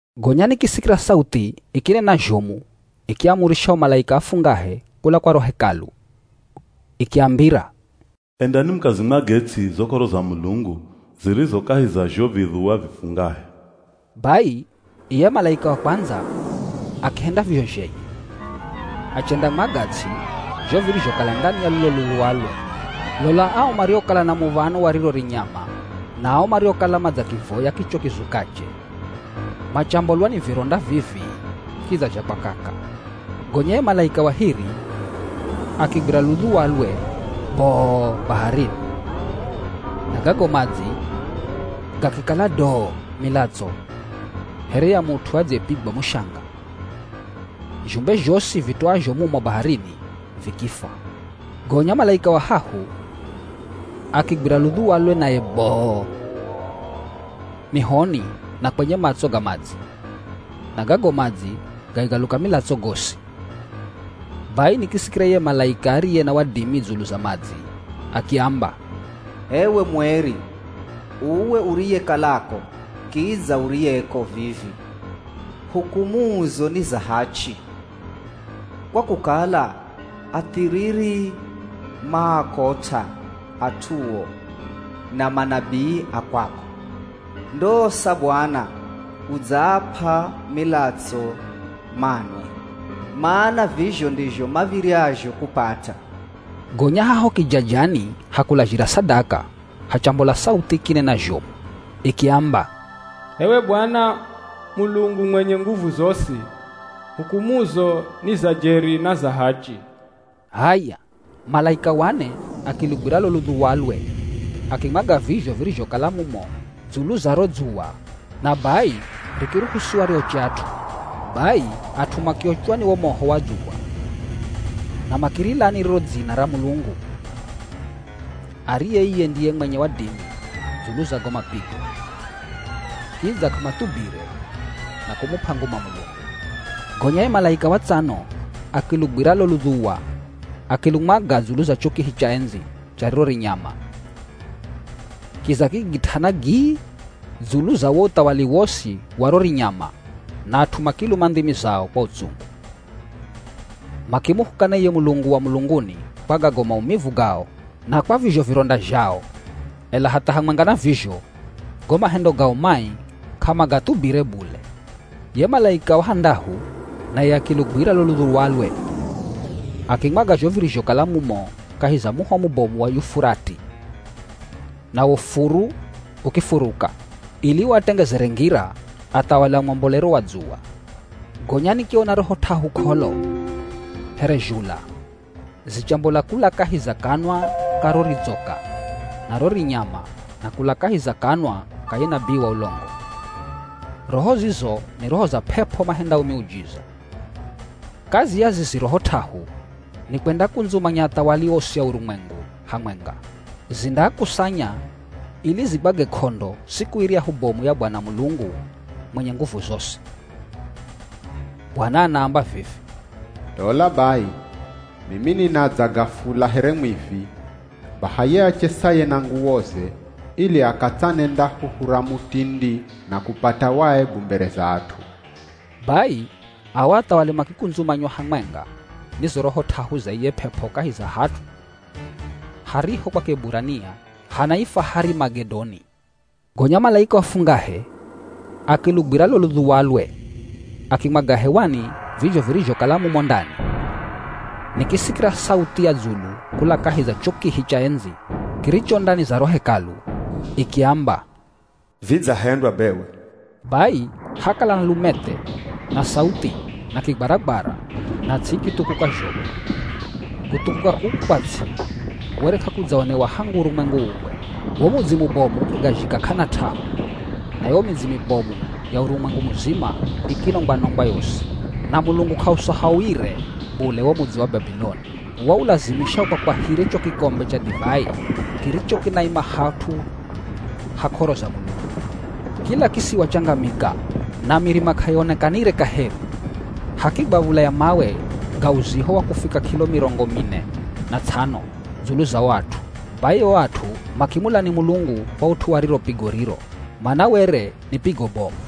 Gonya nikisikira sauthi ikinena zhomu ikiaamurisha o malaika afungahe kula kwa ro Hekalu. Ikiambira, “Endani mukazimwage ts'i zo k'oro za Mulungu zirizo kahi za zho vidhuwa vifungahe.” Bai iye malaika wa kwandza akihenda vizho zhenye. Achendamwaga ts'i zho virizhokala ndani ya lulo ludhuwalwe. Lola ao mariokala na muv̱ano wa riro rinyama na ao mariokala madzakivoya kicho kizukache, machambolwa ni vironda vii-vii kidza zha kwakaka. Gonya ye malaika wa hiri akigwira ludhuwalwe boo baharini. Na gago madzi gakikala doo milatso here ya mut'u adziyepigwa mushanga. Zhumbe zhosi vitoazho mumo baharini vikifwa. Gonya malaika wa hahu akigwira ludhuwalwe naye boo, mihoni na kwenye matso ga madzi, na gago madzi gakigaluka milatso gosi. Bai nikisikira iye malaika ariye na wadimi dzulu za madzi akiamba, “H'ewe mueri, uwe uriyekalako kidza uriyeko vivi, hukumuzo ni za hachi. Kwa kukala athiriri maakot'a at'uo na manabii a kwako, ndosa Bwana udzaap'a milatso manwe. Mana vizho ndizho mav̱iryazho kupata.” Gonya haho kijajani ha kulazhira sadaka hachambola sauthi ikinena zhomu ikiamba, “H'ewe Bwana Mulungu mwenye nguvu zosi, hukumuzo ni za jeri na za hachi.” H'aya, malaika wa ne akilugwira lo ludhuwalwe akimwaga vizho virizhokala mumo dzulu za ro dzuwa na bai rikiruhusiwa rioche at'u. Bai at'u makiochwa ni wo moho wa dzuwa, na makirilani riro dzina ra Mulungu, ariye iye ndiye mwenye wadimi dzulu za go mapigo. Kidza k'amathubire na kumup'a nguma Mulungu. Gonya ye malaika wa tsano akilugwira lo ludhuwa akilumwaga dzulu za cho kihi cha endzi cha riro rinyama. Kiza kikigit'ana gii dzulu za wo uthawali wosi wa ro rinyama na at'u makiluma ndhimi zao kwa utsungu. Makimuhukana iye Mulungu wa mulunguni kwa gago maumivu gao na kwa vizho vironda zhao, ela hatha hamwenga na vizho, go mahendo gao mai k'amagathubire bule. Ye malaika wa handahu naye akilugwira lo ludhuwalwe, akimwaga zho virizhokala mumo kahi za muho mubomu wa Yufurati. Nawo furu, ukifuruka, ili uatengezere ngira athawali a mwambolero wa dzuwa. Gonya nikiona roho t'ahu k'olo here zhula zichambola kula kahi za kanwa ka ro ridzoka na ro rinyama na kula kahi za kanwa ka ye nabii wa ulongo. Roho zizo ni roho za p'ep'o mahendao miujiza. Kazi ya zizi roho t'ahu ni kwendakundzumanya athawali osi a urumwengu hamwenga. Zindaakusanya ili zigwage k'ondo siku iryahu bomu ya Bwana Mulungu mwenye nguvu zosi. Bwana anaamba vivi, “Lola bai, mimi ninadza gafula here mwivi. Baha ye achesaye na nguwoze ili akatsanenda huhu ra mutindi na kupata waebu mbere za at'u.” Bai ao athawali makikundzumanywa hamwenga ni zo roho t'ahu za iye p'ep'o kahi za hat'u hariho kwa Kieburania hanaifwa Harimagedoni. Gonya malaika wa fungahe akilugwira lo ludhuwalwe akimwaga hewani vizho virizhokala mumo ndani. Nikisikira sauthi ya dzulu kula kahi za cho kihi cha endzi kiricho ndani za ro Hekalu. Ikiamba, “Vidzahendwa bewe.” Bai hakala na lumethe, na sauthi, na kigwaragwara na ts'i ikithukuka zhomu. Kuthukuka kuku kwa ts'i were k'akudzaonewa hangu urumwengu uumbwe. Wo mudzi mubomu ukigazhika k'ana t'ahu, na yo midzi mibomu ya urumwengu muzima ikinongwa-nongwa yosi. Na Mulungu k'ausahauire bule wo mudzi wa Babiloni. Waulazimisha ukwakwahire cho kikombe cha divai kiricho kinaima hat'u ha k'oro za Mulungu. Kila kisiwa changamika na mirima k'aionekanire kaheri. Hakigwa v̱ula ya mawe ga uziho wa kufika kilo mirongo mine na ts'ano dzulu za o at'u. Bai o at'u makimulani Mulungu kwa ut'u wa riro pigo riro, mana were ni pigo bomu.